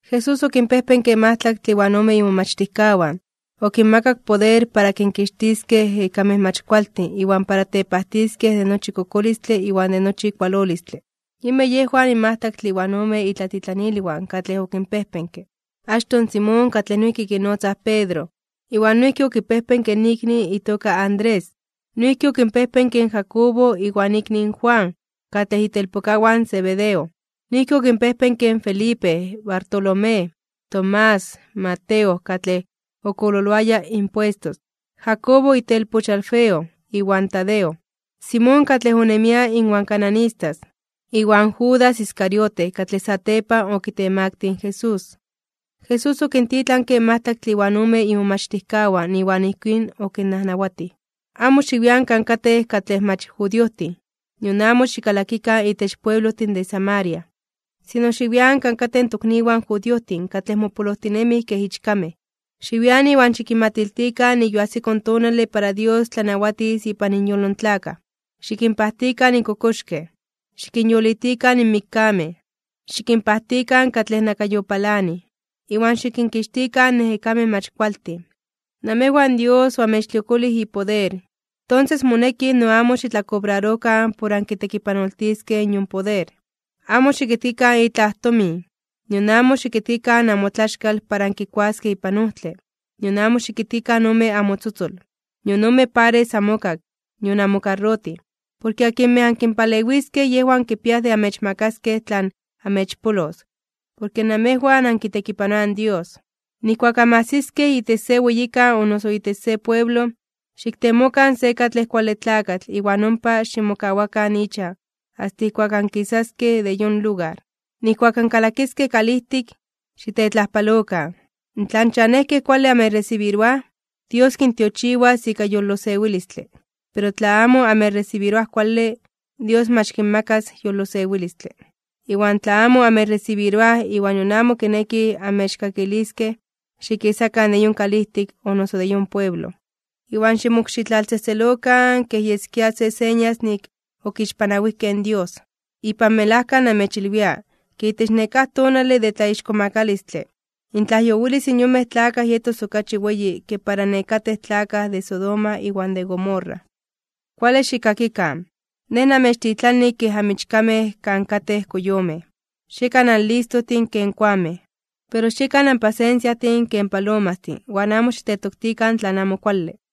Jesús okinpejpenke majtlaktle iwan ome imomachtijkawan, okinmakak poder para kinkixtiskej ejekamej mach kualtin iwan para tepajtiskej de nochi kokolistle iwan de nochi kualolistle. Yinmej yejwan in majtlaktle iwan ome itlatitlanilwan katlej okinpejpenke: Achtoj in Simón, katlej noijki kinotzaj Pedro, iwan noijki okipejpenke in ikni itoka Andrés. Noijki okinpejpenke in Jacobo iwan ikni Juan, katlej itelpokawan in Zebedeo. Noijki okinpejpenke in Felipe, Bartolomé, Tomás, Mateo katlej okololoaya impuestos. Jacobo itelpoch in Alfeo, iwan Tadeo. Simón katlej onemia iwan cananistas, iwan Judas Iscariote katlej satepan okitemaktij (okitemaktilij) in Jesús. Jesús okintitlanke majtlaktle iwan omen imomachtijkawan iwan ijkín okinnajnawatij: ―Amo xiwian kan katej katlej mach judiojtin, nion amo xikalakikan itech pueblojtin de Samaria. Sino xiwian kan katej in tokniwan judiojtin katlej mopolojtinemij kej ichkamej. Xiwian, iwan xikinmatiltikan nik yoajsiko in tonale para Dios tlanawatis ipan inyolo in tlakaj. Xikinpajtikan in kokoxkej, xikinyolitikan in mikkamej, xikinpajtikan katlej nakayopalanij, iwan xikinkixtikan in ejekamej mach kualtin. Namejwan Dios oamechtliokolij ipoder, tonses moneki no amo xitlakobrarokan por ankitekipanoltiskej in yon poder. ’Amo xikitkikan itlaj tomin, nion amo xikitkikan amotlaxkal para ankikuaskej ipan ojtle, nion amo xikitkikan ome amotzotzol, nion ome pares amokak, nion amokarrotij. Porke akinmej ankinpalewiskej yejwan kipiaj de amechmakaskej tlan amechpolos, porke namejwan ankitekipanoaj in Dios. ’Nijkuak anmajsiskej itech se weyikan o itech se pueblo, xiktemokan se katlej kuale tlakatl iwan ompa ximokawakan ichan asta ijkuak ankisaskej de yon lugar. Nijkuak ankalakiskej kalijtik, xitetlajpalokan. Tla in chanejkej kuale amechresibiroaj, Dios kintiochiwas ika yolosewilistle. Pero tla amo amechresibiroaj kuale, Dios mach kinmakas yolosewilistle. Iwan tla amo amechresibiroaj iwan nion amo kinekij amechkakiliskej, xikisakan de yon kalijtik o noso de yon pueblo, iwan ximokxitlaltzejtzelokan kej yeskia se señas nik okixpanawijkej in Dios. Ipan melajka namechilwia, ke itech nekáj tonale de tlaixkomakalistle (tlatzonmanalos), intlajyowilis in yonmej tlakaj yetos okachi weyi ke para nekatej tlakaj de Sodoma iwan de Gomorra. ’¡Kuale xikkakikan! Nej namechtitlani kej amichkamej kan katej koyomej. Xiekan anlistojtin ken koamej, pero xiekan anpasensiajtin ken palomastin iwan amo xitetoktikan tlan amo kuale.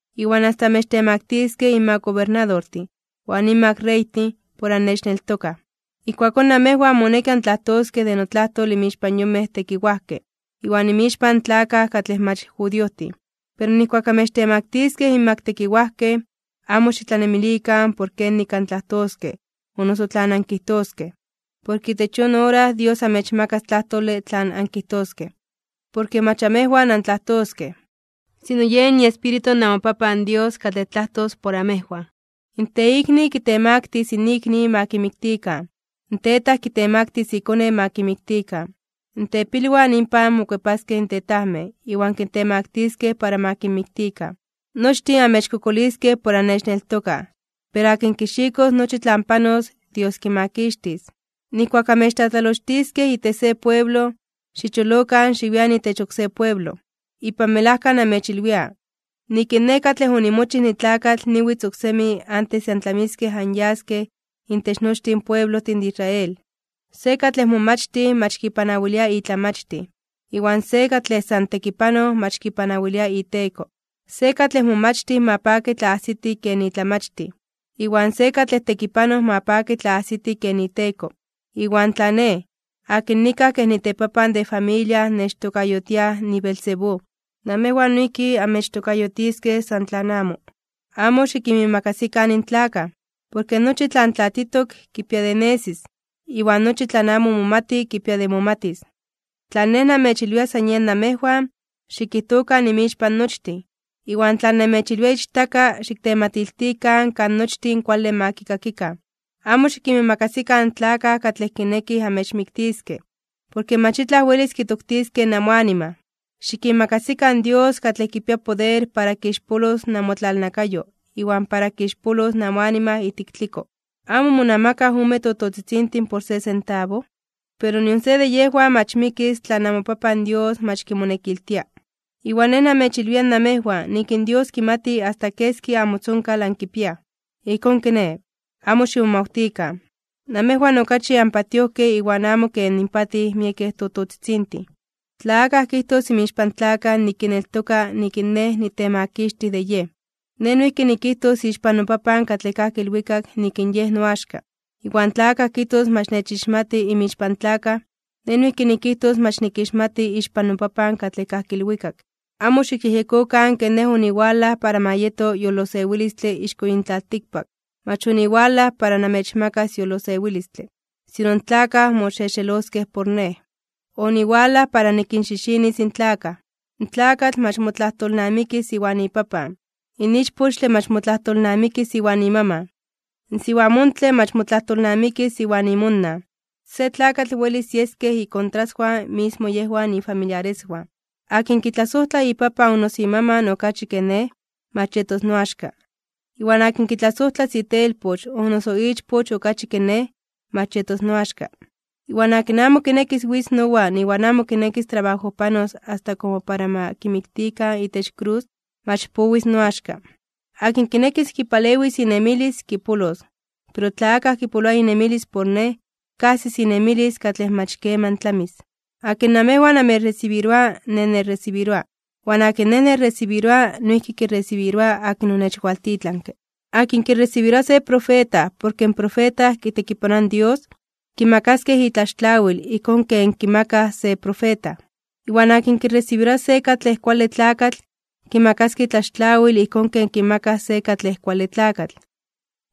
Iwan asta amechtemaktiskej inmak gobernadortin iwan inmak reytin por annechneltokaj. Ijkuakón namejwan moneki antlajtoskej de notlajtol inmixpan yonmej tekiwajkej, iwan inmixpan in tlakaj katlej mach judiojtin. Pero nijkuak amechtemaktiskej inmak tekiwajkej, amo xitlanemilikan por kenik antlajtoskej o noso tlan ankijtoskej. Porke itech yon ora Dios amechmakas tlajtole tlan ankijtoskej. Porke mach amejwan antlajtoskej, sino yen iEspíritu namoPapan Dios katlej tlajtos por amejwan. ’In teikni kitemaktis (kitemaktilis) in ikni ma kimiktikan, in tetaj kitemaktis ikone ma kimiktikan, in tepilwan inpan mokuepaskej in tetajmej iwan kintemaktiskej para ma kinmiktikan. Nochtin amechkokoliskej por annechneltokaj. Pero akin kixikos nochi tlan panos, Dios kimakixtis. Nijkuak amechtlatlalochtiskej itech se pueblo, xicholokan xiwian itech oksé pueblo. Ipan melajka namechilwia, nik in Nej katlej onimochij nitlakatl niwitz oksemi antes de antlamiskej anyaskej itech nochtin pueblojtin de Israel. ’Se katlej momachtij mach kipanawilia itlamachtij, iwan se katlej san tekipanoj mach kipanawilia iteko. Se katlej momachtij ma paki tla ajsiti ken itlamachtij, iwan se katlej tekipanoj ma paki tla ajsiti ken iteko. Iwan tla Nej, akin nikaj kej nitepapan de familia nechtokayotiaj niBeelzebú, namejwan noijki amechtokayotiskej san tlan amo. ’Amo xikinmiimakasikan in tlakaj. Porke nochi tlan tlatitok kipia de nesis, iwan nochi tlan amo momati kipia de momatis. Tlan Nej namechilwia san yen namejwan, xikijtokan inmixpan nochtin. Iwan tlan namechilwia ichtaka, xiktematiltikan kan nochtin kuale ma kikakikan. Amo xikinmiimakasikan in tlakaj katlej kinekij amechmiktiskej, porke mach itlaj welis kitoktiskej namoanima. Xikimakasikan in Dios katlej kipia poder para kixpolos namotlalnakayo iwan para kixpolos namoanima ijtik tliko. ’¿Amo monamakaj ome tototzitzintin por se sentabo? Pero nion se de yejwan mach mikis tla namoPapan Dios mach kimonekiltia. Iwan Nej namechilwia namejwan nik in Dios kimati asta keski namotzonkal ankipiaj. Ijkón kiné, amo ximomawtikan. Namejwan okachi anpatiojkej iwan amo ken inpatij miekej tototzitzintin. ’Tla akaj kijtos inmixpan tlakaj nik kineltoka nik in Nej nitemakixtij de yej, Nej noijki nikijtos ixpan noPapan katlej kajki ilwikak nik in yej noaxka. Iwan tla akaj kijtos mach nechixmati inmixpan tlakaj, Nej noijki nikijtos mach nikixmati ixpan noPapan katlej kajki ilwikak. ’Amo xikyejyekokan ke Nej oniwalaj para ma yeto yolosewilistle ixko yin tlaltikpak. Mach oniwalaj para namechmakas yolosewilistle, sino in tlakaj moxexeloskej por Nej. Oniwalaj para nikinxixinis in tlakaj. In tlakatl mach motlajtolnamikis iwan ipapan, iwan ichpochtle mach motlajtolnamikis iwan imaman. In siwamontle mach motlajtolnamikis iwan imonan. Se tlakatl welis yeskej ikontraswan mismo yejwan ifamiliareswan. ’Akin kitlasojtla ipapan o noso imaman okachi ke Nej, mach yetos noaxka. Iwan akin kitlasojtlas itelpoch o noso ichpoch okachi ke Nej, mach yetos noaxka. Iwan akin amo kinekis witz nowan iwan amo kinekis trabajojpanos asta komo para ma kimiktikan itech krus, mach powis noaxka. Akin kinekis kipalewis inemilis, kipolos, pero tla akaj kipoloa inemilis por Nej, kajsis inemilis katlej mach keman tlamis. ’Akin namejwan amechresibiroa, Nej nechresibiroa. Iwan akin Nej nechresibiroa, noijki kiresibiroaj akin onechwaltitlanke. Akin kiresibiroa se profeta porke in profeta kitekipanoa in Dios, kimakaskej itlaxtlawil ijkón ken kimakaj se profeta. Iwan akin kiresibiroa se katlej kuale tlakatl, kimakaskej itlaxtlawil ijkón ken kimakaj se katlej kuale tlakatl.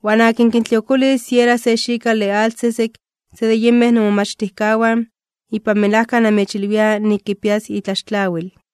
Iwan akin kintliokolis siera se xikale atl sesek se de yinmej nomomachtijkawan, ipan melajka namechilwia nik kipias itlaxtlawil.